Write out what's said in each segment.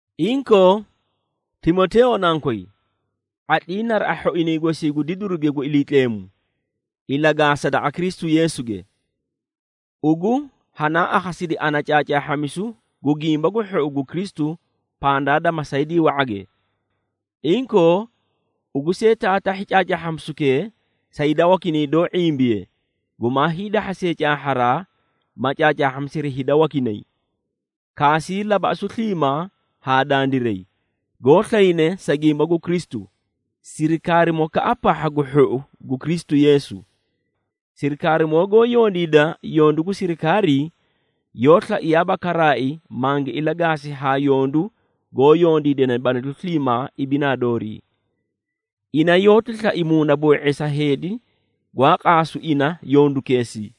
Inkoo, Timoteeyo nankoy, ⁄atlii naraꞌa hhoinay gosii gu didiruge gu Iliitleemu ilagaasa daqa Kristu Yeesuge. Ugu hanaa akhasidi ana caacaahhamisu gu Gimba gu Hhou gu Kristu pandaa da masaydii wa⁄age. Inkoo, ugu see taatahhi caacaahhamisukee sa hida wakinay doó ⁄imbiye gumaa hiidahhasee caahharaa, ma caacaahhamisiri hida wakinay. Kaasii labaꞌasu sliimaa haa dandiray, goó slayne sa gimba gu Kristu, sirikaarimokaꞌa pahha gu hhou gu Kristu Yeesu. Sirikaarimoo goó yondiida yondu gu sirikaarii, yoó slaiyaaba karaai mangi ilagaasi haa yondu goó yondiidane balalu sliimaa ibinaa doorii. Ina yoóti slai muunaboo⁄eesa heedi, gwaa qaasu ina yondukeesii.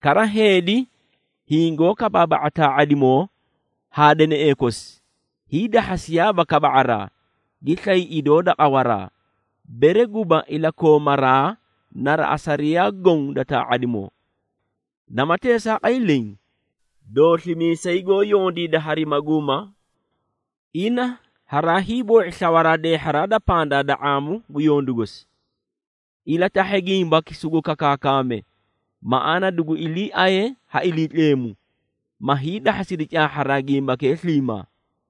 Kara heedi hingoó kabaaba⁄a taa⁄adimoo haa deneꞌee kosi, hiidahhasiyaaba kaba⁄araa, gi slay idoo da qawaraa, bere guba iliikoomaraa naraꞌa sariyaa goõ da taa⁄adimoo. Nama teesaaqay leẽ, dooslimiisay goó yondiida hari maguuma, ina haraa hiiboo⁄i slawaraa deehharaa da pandaa da ⁄aamu gu yondu gosi. Ilatahhe gimbaki sugu kakaakame, maꞌaana dugu iliiaye ha Iliitleemu, ma hiidahhasidi caahha gimbakee sliimaa.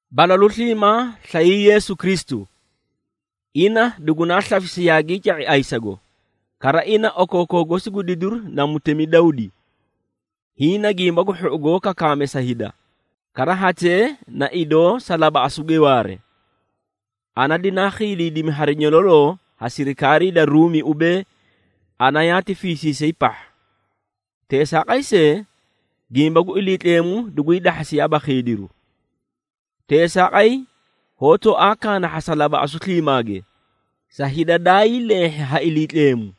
Balalu sliimaa slayii Yeesu Kristu! Ina dugunaa slafisi yaagii ca⁄i ayisago, kara ina okookoo gosi gu didiru na mutemi Dawdi. Hiĩ na Gimba gu Hhou goó kakaame sa hida, kara hatee na idoo sa labaꞌasuge waare. Ana dinaa khiidiidimi hari nyololoo ha sirikaarii da Ruumi ubee, ana yaati fiisiisay pahha. Teesaaqay see, gimba gu Iliitleemu duguyii dahhasiyaaba khiidiru. Teesaaqay hoó tooaa kaanahhasa labaꞌasu sliimaage, sa hida dayii leehhi ha Iliitleemu,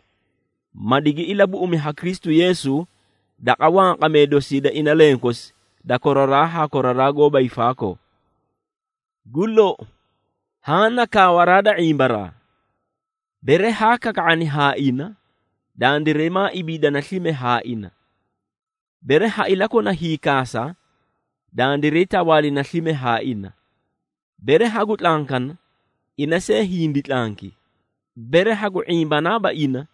ma digi ilabuꞌumi ha Kristu Yeesu daqa wanqamee dosii da ina lenkosi da koraraa haa koraraa goóba hiifaakoo. Gu lou, haã na kaawaraa da ⁄imbaraa: Bere haa kaka⁄ani haa ina, dandiray maa ibiidana slime haa ina, Bere ha ilakona hiikaasa, dandiray tawaalina slime haa ina, bere hagu tlankana, ina see hindi tlanki. Bere hagu ⁄imbanaaba ina,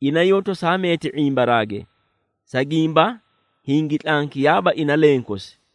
ina yoó tosaa meeti ⁄imbaraage, sa gimba hingi tlankiyaaba ina lenkosi.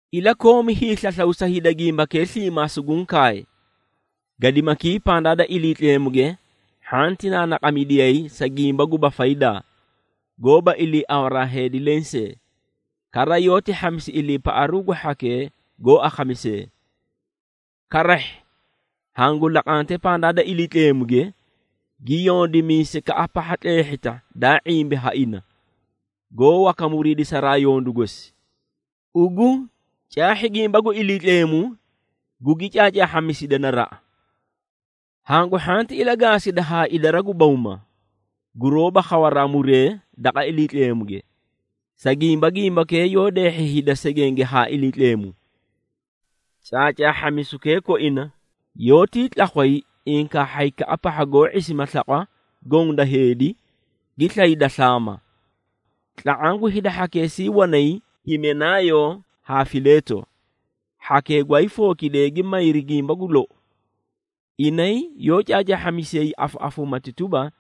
Ilakoomi hiislaslaw sa hida gimbakee sliimaa suguũ kaay. Gadimakii pandaa da Iliitleemuge hhanti naanaqamidiyay sa gimba guba faydaa, goóba iliiawaraa heedi lensee, kara yoóti hhamisi iliipaꞌaru gu hhakee goó akhamisee. Karahhi hangu laqante pandaa da Iliitleemuge, gi yondimiisaykaꞌa pahha tleehhita daa ⁄imbi ha ina, goó waka muriidisaraa yondu gosi. Ugu caahhi gimba gu Iliitleemu, gugi caacaahhamisida naraꞌa. Hangu hhanti ilagaasida haa idara gu bawma, guroóba khawa muree daqa Iliitleemuge, sa gimba gimbakee yoó deehhi hida segenge haa Iliitleemu. Caacaahhamisukee koina, yoótii tlakhway inkaahhaykaꞌa pahha goó ⁄isima slaqwa goõ da heedi, gi slayda slaama. Tla⁄aã gu hida hhakeesii wanay, Himenaayo haa Fileeto, hhakee gwaayii fookidee gi mayri gimba gu lou. Inay yoó caacaahhamisiyay afaꞌafuumati tuba,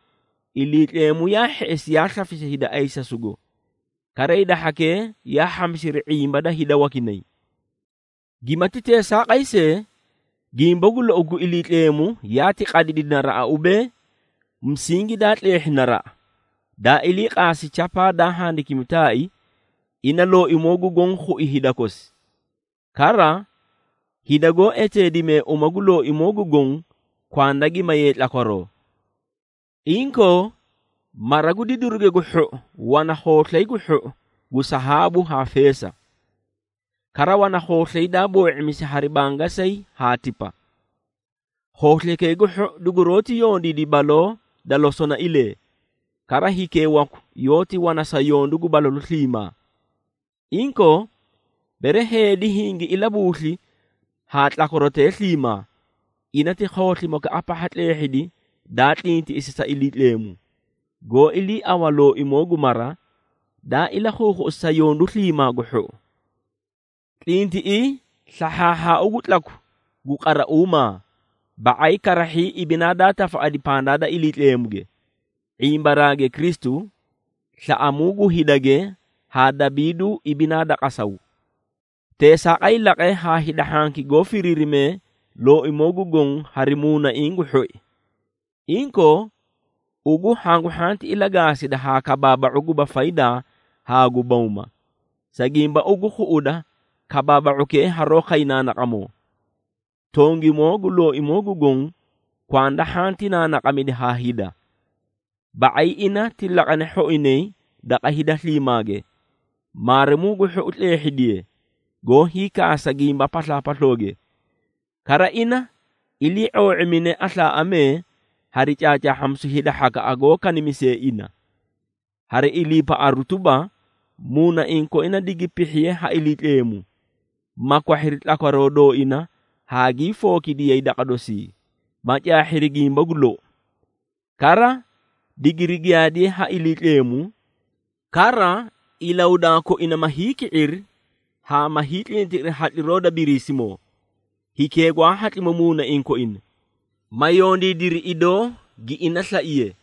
Iliitleemu yaa hheꞌesi yaa slafisi hida ayisasugo, kara hida hhakee yaa hhamisiri ⁄imba da hida wakinay. Gimaati teesaaqay see, gimba gu lou gu Iliitleemu yaati qadidi naraꞌa ubee, musingi daa tleehhi naraꞌa, daa ilii qaasi chapaa daa handikimi taai, “ ‘Ina Looimoo gu Goõ khui hida kosi,’ kara ‘Hida goó eteedimee uma gu Looimoo gu Goõ, kwanda gi mayee tlakwaroo.’” Inkoo mara gu didiruge gu hhou wana khooslay gu hhou gu sahaabu haa feesa. Kara wana khooslay daa boo⁄imisi hari bangasayi haa tipa. Khooslaykee gu hhou duguroóti yondiidi baloo da losonailee, kara hikee waku yoóti wana sa yondu gu balalu sliimaa. Inkoo, bere heedi hingi ilabuusli haa tlakwarotee sliimaa, ina ti khooslimokaꞌa pahha tleehhidi daa tlintiꞌisi sa Iliitleemu, goó iliiaꞌawa Looimoo gu mara, daa ilakhuukhuꞌusi sa yondu sliimaa gu hhou. Tlintiꞌii slahhaahhaau gu tlaku gu qarauumaa, ba⁄ay karahhii ibinaa daa tafaꞌadi pandaa da Iliitleemuge, ⁄imbaraage Kristu, slaꞌamuu gu hidage haa dabiiduu ibinaa da qasaw. Teesaaqay laqe haa hida hhanki goó firiirimee Looimoo gu Goõ hari muunaiĩ gu hhoi. Inkoo ugu hangu hhanti ilagaasida haa kabaaba⁄u guba faydaa haa gu bawma, sa gimba ugu khuꞌuda kabaaba⁄ukee haroó khay naanaqamoo. Tongimoo gu Looimoo gu Goõ kwanda hhanti naanaqamidi haa hida. Ba⁄ay ina ti laqane hhoinay daqa hida sliimaage, maarimuu gu hhou tleehhidiye, goó hiikaasa gimba paslaapaslooge. Kara ina ilii⁄oo⁄imine aslaaꞌamee hari caacaahhamisu hida hhakaꞌa goó kanimisee ina. Hari iliipaꞌaru tuba, muunaiĩ koinay digi pihhiye ha Iliitleemu, ma kwahhiri tlakwaroo dooina haa gii fookidiyay daqa dosii, ma caahhiri gimba gu lou. Kara digiri giyaadiye ha Iliitleemu, kara ilahudaa koina ma hiiki⁄iri haa ma hiitlintiꞌiri hatliroo da Biriisimoo, hikee gwaa khiidimu muunaiĩ koina, ma yondiidiri idoo gi ina slaiye.